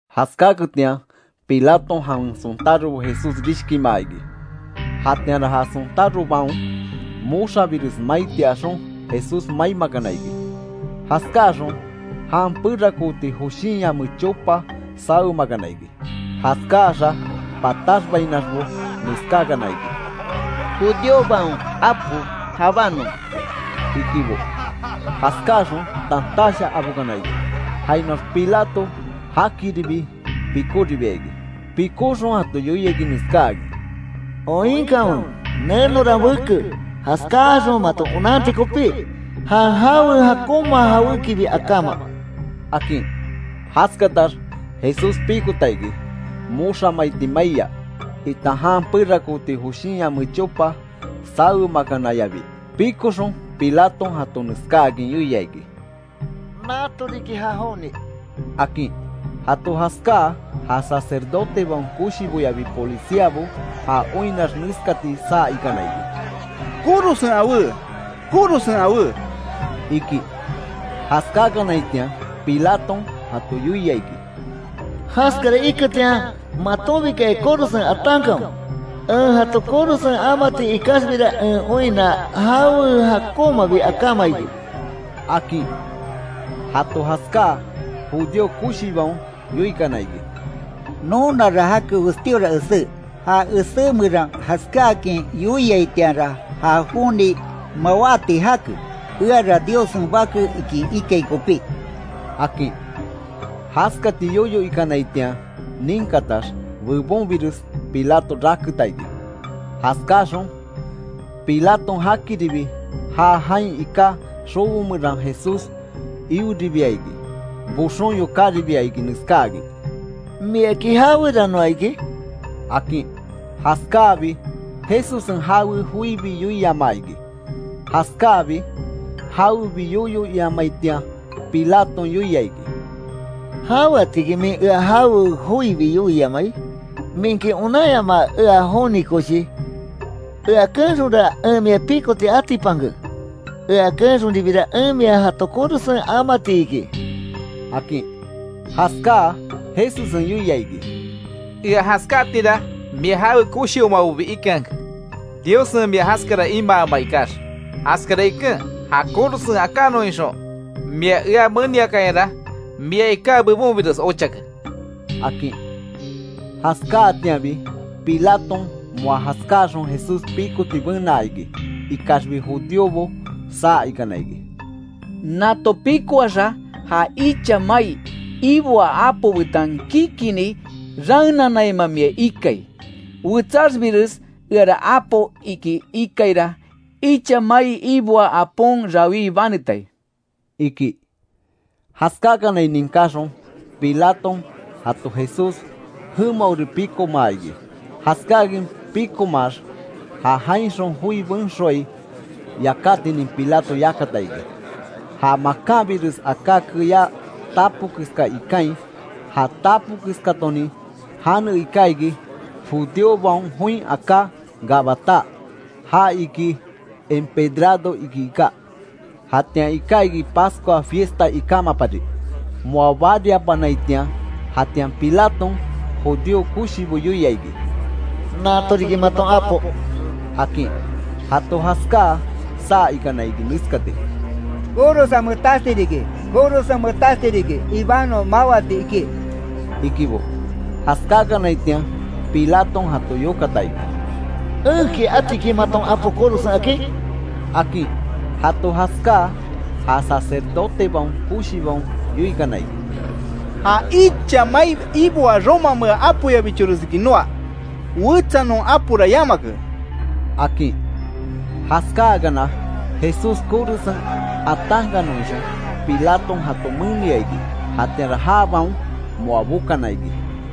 Jaskákanketian, Pilaton jawen sontárobo Jesús rishkimaa iki. Jatianra ja sontárobaon moxabires maiti axon, Jesús maimakana iki. Jaskáaxon jan perakooti joshin yame chopa sawemakana iki. Jaskaaxa pataxbainaxbo neskáakana iki: —¡Judíobaon Apo jabanon! —ikibo. Jaskáaxon tantash abokana iki. Jainoax Pilato jakiribi pikoribia iki. Pikóxon, jato yoia iki neskáakin: —Oinkanwe, nenora en beke, jaskáaxon maton onanti kopi, jan jawe jakonma jawékibi akáma —akin. Jaskatax Jesús pikota iki, moxa maiti maiya, itan jan perakooti joshin yame chopa sawemakanayabi. Pikoxon, Pilaton jato neskáakin yoia iki: —¡Nato riki ja joni! —akin. Jato jaskáa, ja sacerdotebaon koshiboyabi policiabo, ja oinnax neskati saa ikana iki: —¡Korosen awé! ¡Korosen awé! —iki. Jaskakanaitian, Pilaton jato yoia iki: —Jaskara iketian, matonbikaya korosen atankanwe. En jato korosen amati ikaxbira en oinna jawe jakonmabi akáma iki —akin. Jato jaskáa, judío koshibaon yoikana iki: —Nonara jake westíora esé, ja esé meran jaskáakin yoiaitianra ja joni mawáti jake, eara Diossen Bake iki ikai kopí —akin. Jaskati yoyo ikanaitian ninkatax bebonbires Pilato raketa iki; Jaskáxon, Pilaton jakiribi, já jain iká xobo meran Jesús ioribia iki. Boxon yokáribia iki neskáakin: —¿Miaki jaweranoa iki? —akin. Jaskáabi, Jesussen jawe joibi yoiamaa iki. Jaskáabi, jawebi yoyo iamaitian Pilaton yoia iki: —¿Jaweatiki min ea jawe joibi yoiamai? ¿Minki onanyamaa ea joni koshi? Ea keenxonra, en mia pikoti atipanke. Ea keenxonribira en mia jato korosen amati iki —akin. Jaskáa Jesussen yoia iki: —Ea jaskáatira mia jawe koshimabobi ikeanke, Diossen mia jaskara imaama ikax, jaskara iken ja korosen akannon ixon mia ea meniakayara mia iká bebonbires ochake —akin. Jaskáatianbi, Pilaton moa jaskáaxon Jesús pikoti benaa iki. Ikaxbi judíobo saa ikana iki: —¡Nato pikoaxa, ja icha mai iboaa apo betan kikini raenanaima mia ikai! Wetsaxbires eara apo iki ikaira, icha mai iboaa apon rawí banetai —iki. Jaskákanai ninkáxon, Pilaton jato Jesús jemaori pikomaa iki. Jaskáakin pikomaax, ja jainxon joi benxoai yakátinin Pilato yakata iki, ja makanbires aká keyá tapo keska ikain. Ja tapo keskatonin jane iká iki judíobaon join aká Gabatá, ja iki empedrado iki iká. Jatian iká iki Pascua fiesta ikámapari, moa bariapanaitian. Jatian Pilaton judío koshibo yoia iki: —¡Nato riki maton apo! —akin. Jato jaskáa, saa ikana iki neskati: —¡Korosen metasti riki! ¡Korosen metasti riki, ibanon mawati iki! —ikibo. Jaskákanaitian, Pilaton jato yokata iki: —¿Enki atiki maton apo korosen akin? —akin. Jato jaskáa, ja sacerdotebaon koshibaon yoikana iki: —Ja icha mai iboaa romamea apoyabichoresiki noa. Wetsa non apora yamake —akin. Jaskáakana, Jesús korosen atankannon ixon, Pilaton jato menia iki. Jatianra jabaon moa bokana iki.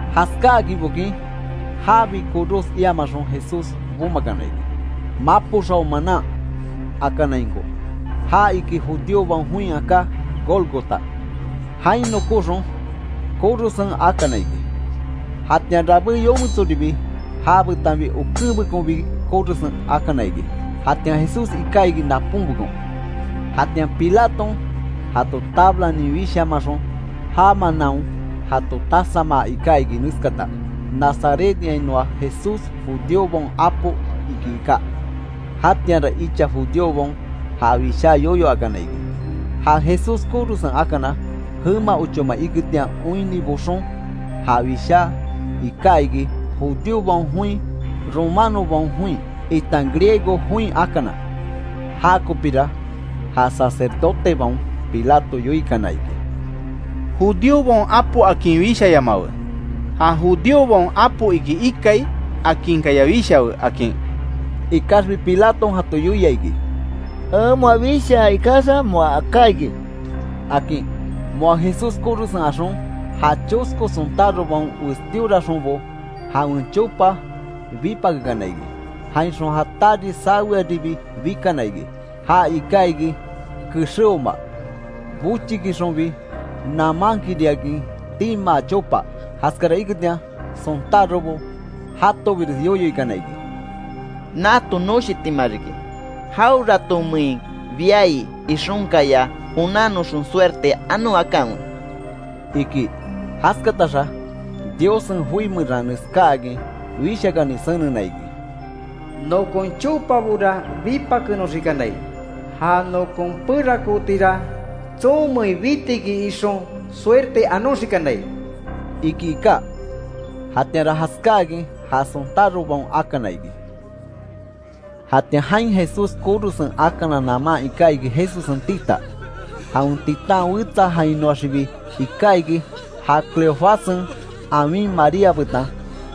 Jaskáakin bokin, jabi koros iamaxon, Jesús bomakana iki, “Mapo xao manan”, akanainko (Ja iki judíobaon join aká Gólgota). Jain nokóxon, korosen akana iki. Jatian rabé yometsoribi ja betanbi okenbekonbi korosen akana iki, jatian Jesús iká iki naponbekon. Jatian Pilaton jato tablanin wishamaxon já manaon jato tasamaa iká iki neskata: “Nazarethainoa Jesús, judíobaon Apo”, iki iká. Jatianra icha judíobaon ja wishá yoyo akana iki, ja Jesús korosen akana, jema ochoma iketian oinni boxon, ja wishá iká iki, judíobaon join, romanobaon join, itan griego join akana. Jakopira ja sacerdotebaon Pilato yoikana iki: —Judíobaon apo akin wishayamawe ‘Ja judíobaon Apo iki ikai’, akinkaya wishawe —akin. Ikaxbi Pilaton jato yoia iki: —En moa wishaa ikaxa, moa aká iki —akin. Moa Jesús korosen axon, ja chosko sontárobaon westíoraxonbo jawen chopabo bipakekana iki. Jainxon, ja tari sawetiribi bikana iki, ja iká iki kexéoma, bochikixonbi namaankiriakin timáa chopa. Jaskara iketian, sontárobo jatobires yoyo ikana iki: —Nato noshitima riki, jaweratonmein biai ixonkaya onannoxon suerte anon akanwe —iki. Jaskataxa Diossen joi meran neskáakin Wishakani senena iki: “Nokon chopabora bipakenoxikanai, ja nokon perakootira, tsonmein bitiki ixon, suerte anoxikanai”, iki iká. Jatianra jaskáakin ja sontárobaon akana iki. Jatian jain Jesús korosen akana naman iká iki Jesussen tita, jawen titan wetsa jainoaxibi iká iki ja Cleofássen awin María betan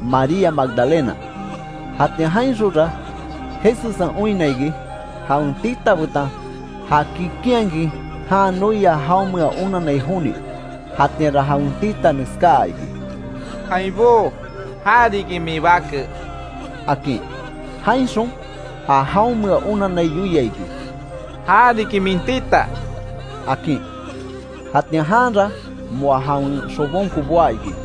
María Magdalena. Jatian jainxonra, Jesussen oinna iki, jawen tita betan ja kikinhakin jan noia jaonmea onanai joni. Jatianra jawen tita neskaa iki: —Ainbó, ja riki min bake —akin. Jainxon, ja jaonmea onanai yoia iki: —Ja riki min tita —akin. Jatian janra moa jawen xobonko boá iki.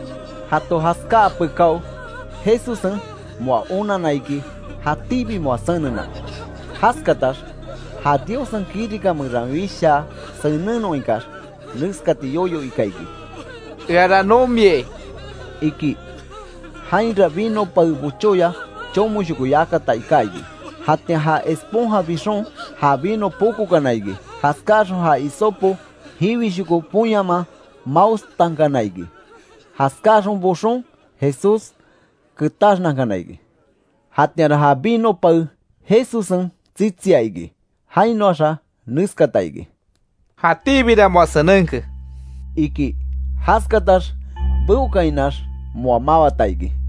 Jato jaskáa pekáo Jesussen moa onanna iki jatíbi moa senena. Jaskatax ja Diossen kirika meran wishaa senennon ikax, neskati yoyo ika iki: —Eara nomiai —iki. Jainra vino pae bochoya chomoshoko yakata iká iki. Jatian ja esponja bixon, ja vino pokokana iki, jaskáaxon ja hisopo jiwishoko ponyaman maostankana iki, jaskáaxon boxon Jesús ketaxnankana iki. Jatianra ja vino pae Jesussen tsitsia iki. Jainoaxa neskata iki: —Jatíbira moa senenke —iki. Jaskatax beókainax moa mawata iki.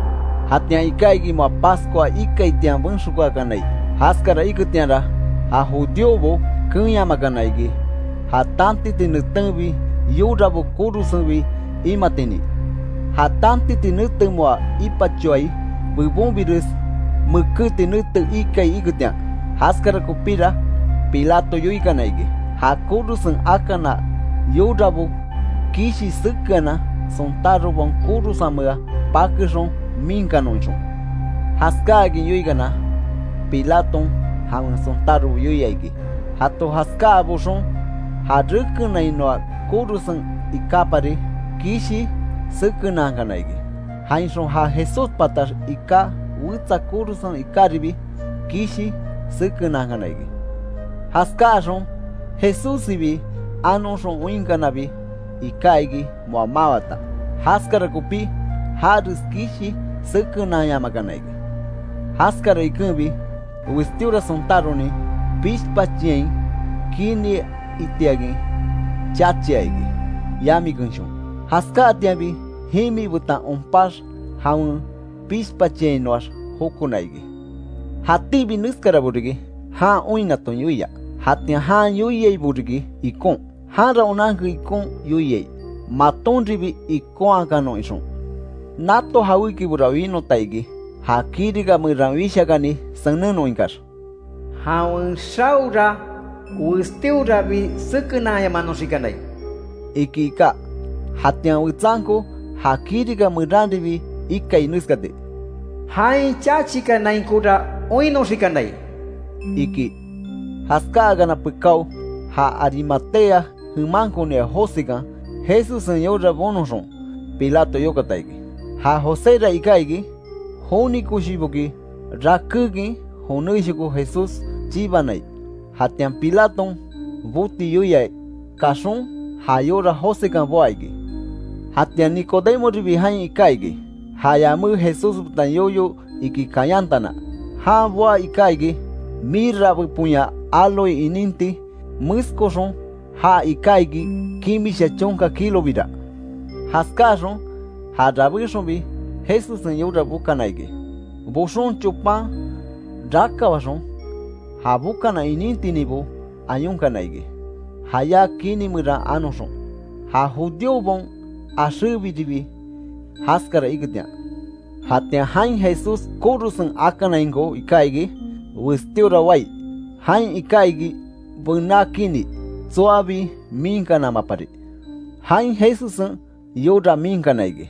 Jatian iká iki moa Pascua ikaitian benxokaakanai, jaskara iketianra ja judíobo keenyamakana iki, ja tantiti netenbi yorabo korosenbi imatinin, ja tantiti nete moa ipachoai bebonbires, mekéti nete ikai iketian. Jaskara kopíra Pilato yoikana iki, ja korosen akana yorabo kishi sekeanan, sontárobaon korosenmea pakexon miinkanon ixon. Jaskáakin yoikana, Pilaton jawen sontárobo yoia iki, jato jaskáa boxon ja rekenainoa korosen ikápari kishi sekenankana iki. Jainxon ja Jesús patax iká wetsa korosen ikáribi, kishi sekenankana iki. Jaskáaxon Jesússibi anoxon oinkanabi, iká iki moa mawata, jaskara kopí jares kishi sekenanyamakana iki. Jaskara ikenbi westíora sontáronin pishpachiain kini itiakin chachia iki, yami kenshon. Jaskáatianbi jimi betan onpax jawen pishpachiainoax jokona iki. Jatíbi neskarabo riki, jan oinnaton yoia, jatian jan yoiaibo riki ikon, janra onanke ikon yoiai, matonribi ikonhakanon ixon. Nato jawékibora winota iki, ja kirika meran Wishakani senennon ikax: “Jawen xaora westíorabi sekenanyamanoxikanai”, iki iká. Jatian wetsanko ja kirika meranribi ikai neskati: “Jain chachikanainkora oinnoxikanai”, iki. Jaskáakana pekáo, ja Arimatea jemankonia Josekan, Jesussen yora bonoxon, Pilato yokata iki. Ja Joséra iká iki, joni koshiboki rakékin jonéshoko Jesús chibanai; jatian Pilaton, boti yoia, kaxon ja yora Josekan boá iki. Jatian Nicodemoribi jain iká iki, ja yamé Jesús betan yoyo iki kayantana. Jan boá iká iki, mirra beponya áloe ininti meskoxon ja iká iki kimisha chonka kilobira. Jaskáaxon, ja rabéxonbi Jesussen yora bokana iki, boxon chopan rakawaxon, ja bokana inintininbo ayonkana iki, jayá kini meran anoxon, ja judíobaon axébiribi jaskara iketian. Jatian jain Jesús korosen akanainko iká iki westíora wai, jain iká iki bená kini, tsoabi miinkanamapari. Jain Jesussen yora miinkana iki;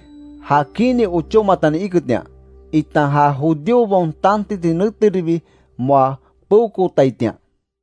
ja kini ochómatani iketian, itan ja judíobaon tantiti neteribi moa peokootaitian.